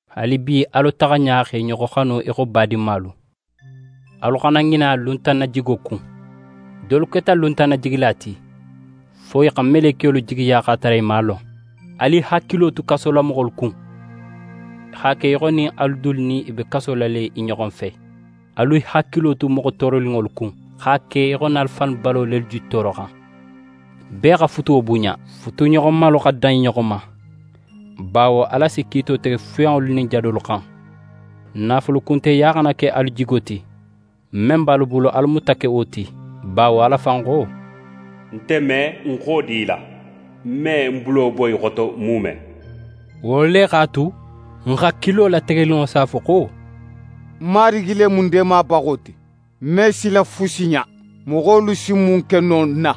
Haalibi alu taxa ɲa xa i ɲoxo xanu í xo badinmalu. Alu xana ŋina luntannajigo kun. Dolu keta luntannajigila ti, fo i xa melekiyolu jigiya x'a tara i man a lon. Alu i hakilo tu kasolamoxolu kun, x'a ke í xo nin alu dulu nin i be kaso la le i ɲoxo fe. Alu i hakilo tu moxo tooroninŋolu kun, x'a ke í xo nin alu fannu balo lelu je tooroxan. Bee xa futuwo bunɲa. Futuɲoxomalu xa dan i ɲoxo ma, bawo Ala si kiito tege fuyanŋolu nin jadolu xan. Naafulukunteya xana ke alu jigo ti. Men be alu bulu alu muta ke wo ti, bawo Ala fan xo: «Nte me ń xodi í la, ń me ń bulo bo í xoto muume.» Wo le x'a tu, n hakilo lategeninŋo si a fo xo: «Marigi le mu ń deemabaxo ti, ń me sila fusi ɲa. Moxolu si mun ke no ń na?»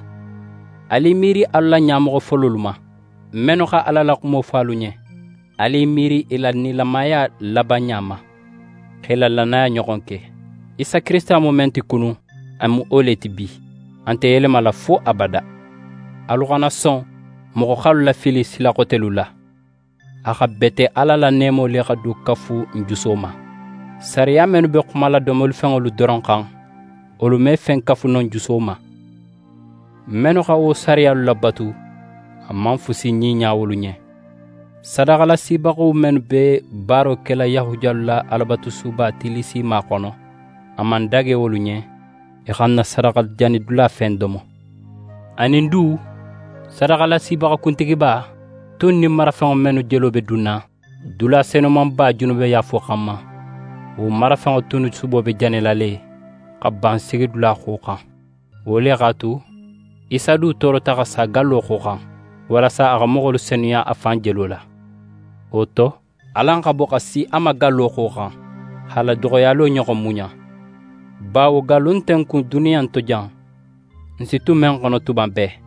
Alu i miiri alu la ɲamoxo fololu ma, mennu xa Ala la xumo fo alu ɲen. Alu i miiri i la nilamaya labanɲa ma, x'e la lannaya ɲoxon ke. Isa Kirisita mu men ti kunun, a mu wo le ti bi, a nte yelemala fo abada. Alu xana son moxo x'alu lafili sila xotelu la. A xa bete Ala la neemo le xa do kafu n juso ma. Sariya mennu be xumala domolifenŋolu doron xan, wolu me fen kafu no n juso ma. Mennu xa wo sariyalu labatu, a man fusi ɲiɲa wolu ɲen. Sadaxalasibaxo mennu be baaro kela Yahudiyalu la Alabatusuba tillisima xono, a man dage wolu ɲen i xa n na sadaxajanidula fen domo. Anin du, sadaxalasibaxa kuntigiba tun nin marafenŋo mennu jelo be dunna dula Senumanba junubeyaafo xanma, wo marafenŋo tunnu subo be janila le xa ban sigidula xoxan. Wo le x'a tu, Isa du toorota xa sa gallo xoxan, walasa a xa moxolu senuya a fan jelo la. Wo to, alan xa bo xa si a ma gallo xoxan, x'a la doxoyalo ɲoxon muɲa. Bawo gallu nte n kun duniya in to jan, n si tu men xono tuma bee;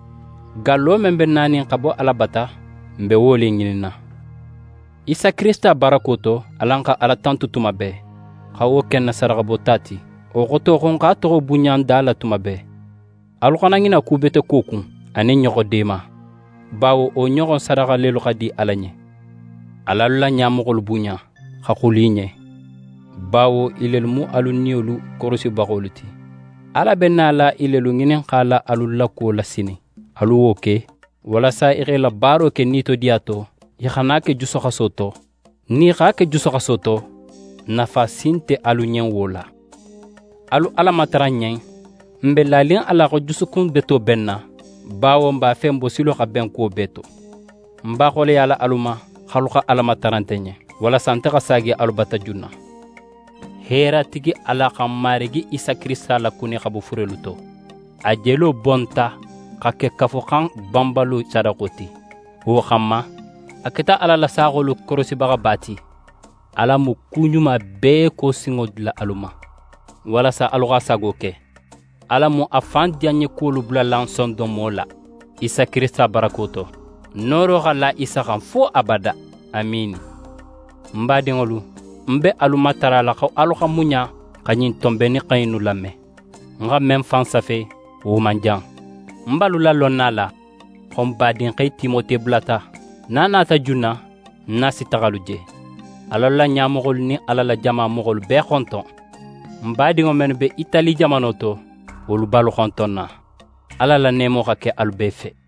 gallo men be nanin xa bo Ala bata, n be wo le ŋininna. Isa Kirisita barako to, alan xa Ala tantu tuma bee, xa wo ke n na sadaxa bota ti; wo xoto xo n x'a toxo bunɲa n da la tuma bee. Alu xana ŋina kubeteko kun, anin ɲoxo deema, bawo wo ɲoxon sadaxa lelu xa di Ala ɲen. Al'alu la ɲamoxolu bunɲa, xa xulu i ɲen, bawo i lelu mu alu niyolu korosibaxolu ti. Ala be nala i lelu ŋininxala alu la kuwo la sinin. Alu wo ke, walasa i x'e la baaro ke nitodiya to, i xana a ke jusuxaso to. Nin i x'a ke jusuxaso to, nafa si nte alu ɲen wo la. Alu Ala matara n ɲen. N be lanin a la xo jusukun beto be n na, bawo n b'a fe n bosilo xa ben kuwo bee to. Ń b'a xoleyala alu ma xo alu xa Ala matara nte ɲen, walasa nte xa saagi alu bata junna. Heeratigi Ala xa n Marigi Isa Kirisita lakuni xa bo furelu to. A jelo bonta xa ke Kafuxan banbalo sadaxo ti. Wo xanma, a keta Ala la saaxolu korosibaxaba ti. Ala mu ku ɲuma bee ko sinŋo dila alu ma, walasa alu x'a sago ke. Ala mu a fan diyanɲekuwolu bulala n sondonmo la, Isa Kirisita barako to. Nooro xa la Isa xan fo abada. Amiini. Ń badinŋolu, ń be alu matarala xo alu xa muɲa xa ɲin tonbennixan innu lame. Ń xa men fan safe, wo man jan. Ń be alu lalonna a la xo n badinxe Timote bulata. Nin a nata junna, ń nin a si taxa alu je. Al'alu la ɲamoxolu nin Ala la jama moxolu bee xonton. N badinŋo mennu be Itali jamano to, wolu be alu xontonna. Ala la neemo xa ke alu bee fe.